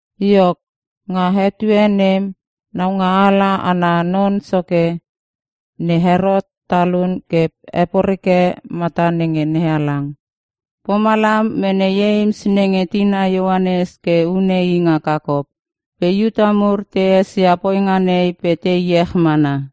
Iok, nga etue nem, naungaala ana non soke ne Herot talun ke heporeke mata nenge NeHalang. Pomalam, mene Ieims nenge tina Ioanes ke hune i nga kakop. Pe Iuta mur te esia poinga nei pe te iech mana.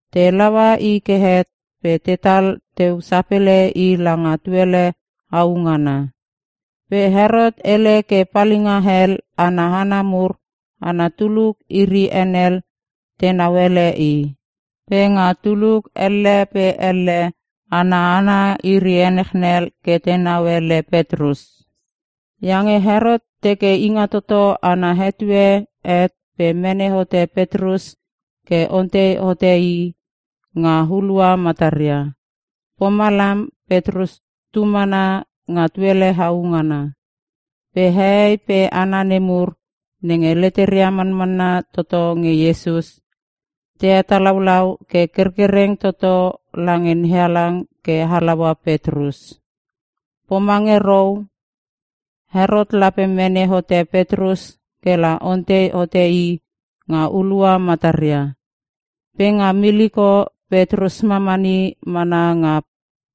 Te laua i ke het pe tetal teu sapele i langa tuele au ngana. Pe Herot hele ke palinga hel ana hana mur ana tuluk iri henel tenau ele i. Pe nga tuluk elle pe elle ana hana iri henechnel ke tenau ele Petrus. Iange Herot teke Ingatoto ana etue het pe mene hote Petrus ke ontei hote i nga hulua mataria. Pomalam, Petrus tumana nga tuele au ngana. Pe hehei pe hana nemur nenge leteria manmanna toto nge Iesus, te hetalaulau ke kerkereng toto lange NeHalang, ke halaua Petrus. Pomange rou, Herot lape mene hote Petrus kela ontei hote i nga hulua mataria. Pe nga miliko, Petrus mamani mana nga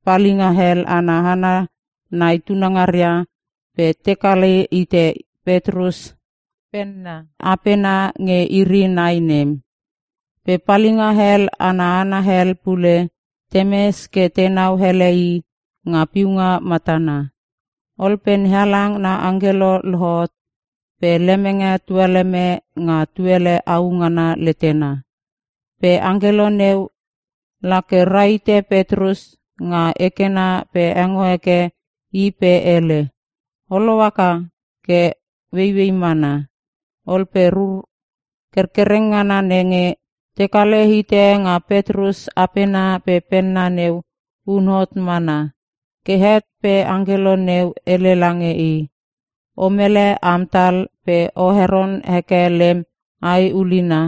palinga hel ana hana nai tunangaria pe tekale hite Petrus penna pe apena nge iri nai nem. Pe palinga hel ana hana hel pule temes ke tenau ele i nga piunga matana. Ol pe NeHalang na angkelo lohot, pe lemenge tualeme nga tuele au ngana letena. Pe angkelo neu, lake rahite Petrus nga ekena pe hengo heke i pe hele, “O lohaka ke ueiuei mana.” Ol pe rur kerkereng ngana nenge tekale hite nga Petrus apena pe penna neu, un hot mana. Ke het pe angkelo neu hele lange i, “O mele am tal pe o heron heke lem ae ulina.”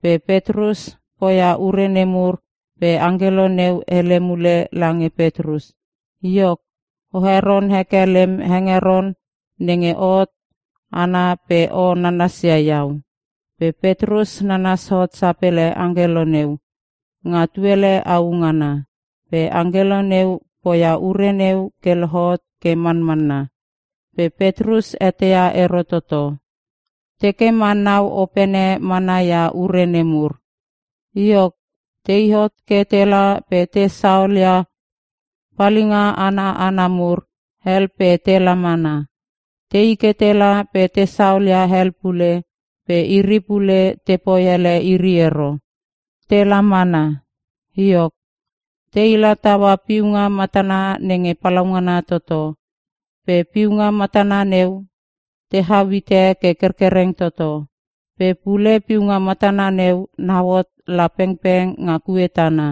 Pe Petrus poia ure nemur Pe angkelo neu hele mule lange Petrus, “Iok, o heron heke lem hengeron nenge hot ana pe o nanasia iau.” Pe Petrus nanas hot sapele angkelo neu, nga tuele au ngana. Pe angkelo neu poia ure neu ke lohot ke manmanna. Pe Petrus eteia ero toto. Teke ma nau opene mana ia ure nemur. Iok, tei hot ke tela pe te saolia palinga ana hana mur hel pe tela mana. Te i ke la pe te saolia hel pule pe iri pule tepoi ele iri ero. Te la mana. Iok, tei la taua piunga matana nenge palaungana toto. Pe piunga matana neu, te chau hite ke kerkereng toto. Pe pule, piunga matana neu, nau hot la pengpeng nga kue tana.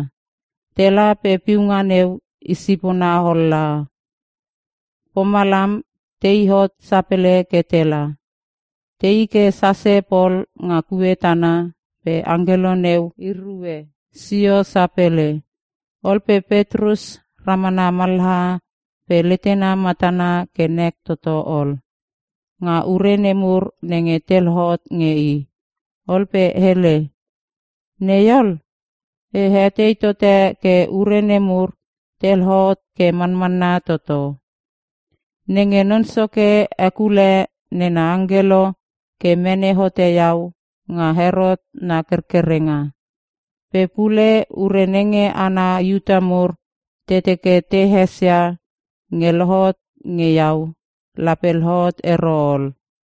Tela pe piunga neu, i sipona olha. Pomalam, tei hot sapele ke tela. Tei ke sase pol nga kue tana, pe angkelo neu erue sio sapele. Ol pe Petrus, ramana mallaha pe letena matana ke nek toto ol, nga ure nemur nenge te lohot nge i. Ol pe hele, “Nei ol, e etei tote ke ure nemur te lohot ke manmanna toto. Nenge Non Soke hekule nena angkelo ke mene hote iau nga Herot na kerkerenga. Pe pule, ure nenge hana Iuta mur te teke te esia nge lohot nge iau, lape lohot ero ol.”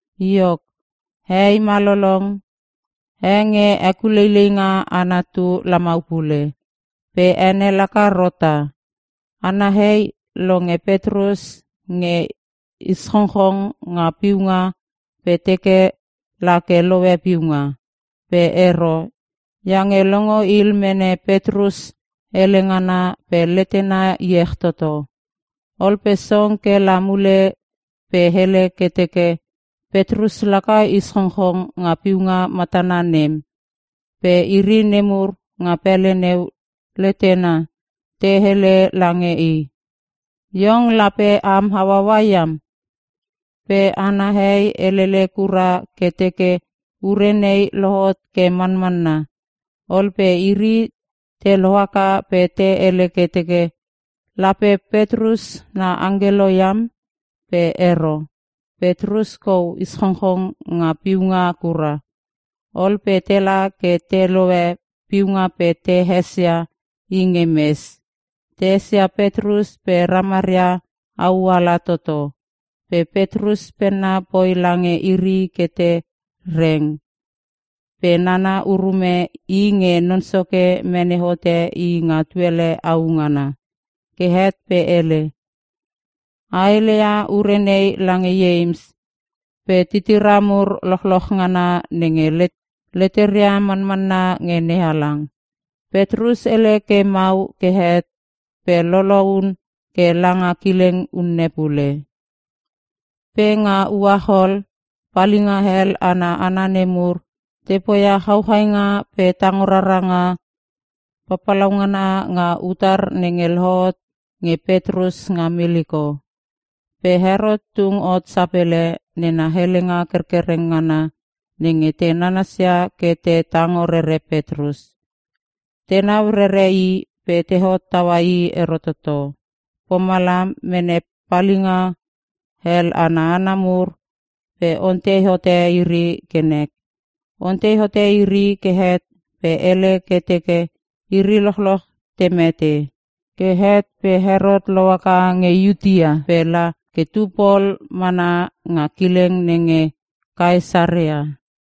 Iok, hei malolong e nge hekuleileinga ana tu lamau pule. Pe ene laka Rota. Ana hei, longe Petrus nge ischongchong nga piunga, pe teke lake loe piunga. Pe ero. Iange longo il mene Petrus hele ngana pe letena iech toto. Ol pe song ke la mule pe hele ke teke, “Petrus laka ischongchong nga piunga matana nem!” Pe iri nemur nga pele neu letena, te hele lange i, “Iong, lape am hauaua iam!” Pe ana hei helele kura ke teke ure nei lohot ke manmanna. Ol pe iri te lohaka pe te hele ke te teke, “Lape Petrus na angkelo iam.” Pe ero, Petrus kou ischongchong nga piunga kura. Ol pe tela ke teloe piunga pe te esia i nge mes. Te esia Petrus pe ramaria au ala toto. Pe Petrus penna poi lange iri ke te reng, pe nana urume i nge Non Soke mene hote i nga tuele au ngana. Ke het pe hele, “A heleia ure nei lange Ieims, pe titira mur lochloch ngana nenge leteria manmanna nge NeHalang.” Petrus hele ke mau ke het pe loloun ke langa kileng unne pule. Pe nga uach ol, palinga hel ana hana nemur te poia chauchainga pe tangoraranga palauangana nga utar nenge lohot nge Petrus nga miliko. Pe Herot tung hot sapele nena helenga kerkereng ngana, nenge te nanasia ke te tango rere Petrus. Tenau rere i pe tehot taua i ero toto. Pomalam, mene palinga hel ana hana nemur, pe ontei hote iri ke nek. Ontei hote iri ke het pe hele ke teke iri lochloch te mete. Ke het pe Herot lohaka nge Iutea pe la ke tu pol mana nga kileng nenge Kaesarea.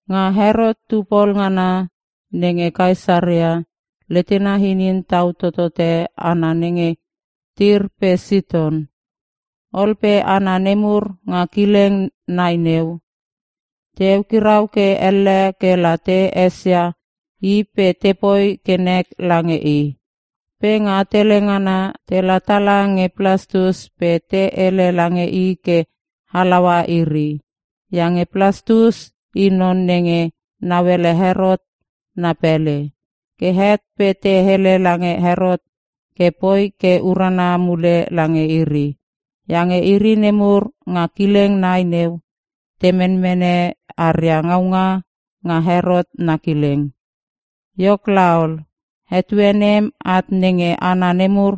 Nga Herot tu pol ngana nenge Kaesarea, letena inin tau totote hana nenge Tir pe Siton. Ol pe hana nemur nga kileng nai neu, te eukirau ke elle ke la te esia i pe tepoi ke nek lange i. Pe nga tele ngana, tela tala nge Plastus pe te hele lange i ke halaua iri. Iange Plastus i non nenge nauele Herot na pele. Ke het pe te hele lange Herot ke poi ke urana mule lange iri, iange iri nemur nga kileng nai neu, te menmene aria ngaunga nga Herot na kileng. Iok laol, etue nem at nenge hana nemur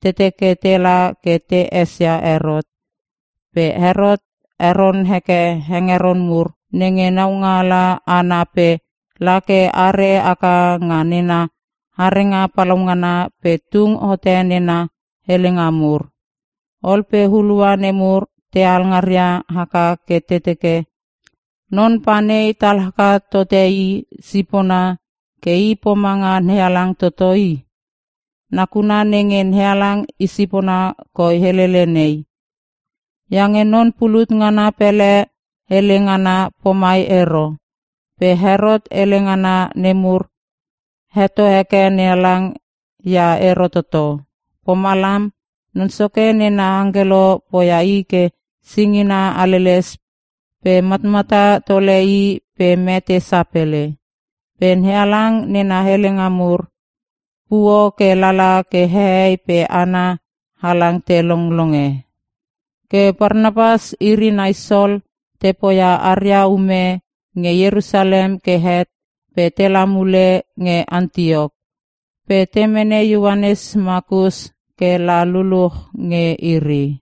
te teke tela ke te esia Herot. Pe Herot heron heke hengeron mur nenge naungaala ana pe la ke are haka nga nena arenga palaungana pe tung hote nena helenga mur. Ol pe hulua nemur te alngaria haka ke te teke, “Non pa nei tal haka tote i sipona ke i pomanga NeHalang toto i! Nakuna nenge NeHalang i sipona koi helele nei, iange non pulut ngana pele hele ngana pomai ero.” Pe Herot hele ngana nemur, heto heke NeHalang ia ero toto. Pomalam, Non Soke nena angkelo poia i ke singina haleles pe matmata tole i pe mete sapele. Pe NeHalang nena helenga mur, puo ke lala ke hehei pe hana halang te longlonge. Ke Parnapas iri nai Sol te poia aria ume nge Ierusalem ke het pe tela mule nge Antiok. Pe te mene Ioanes Makus ke la luluch nge iri.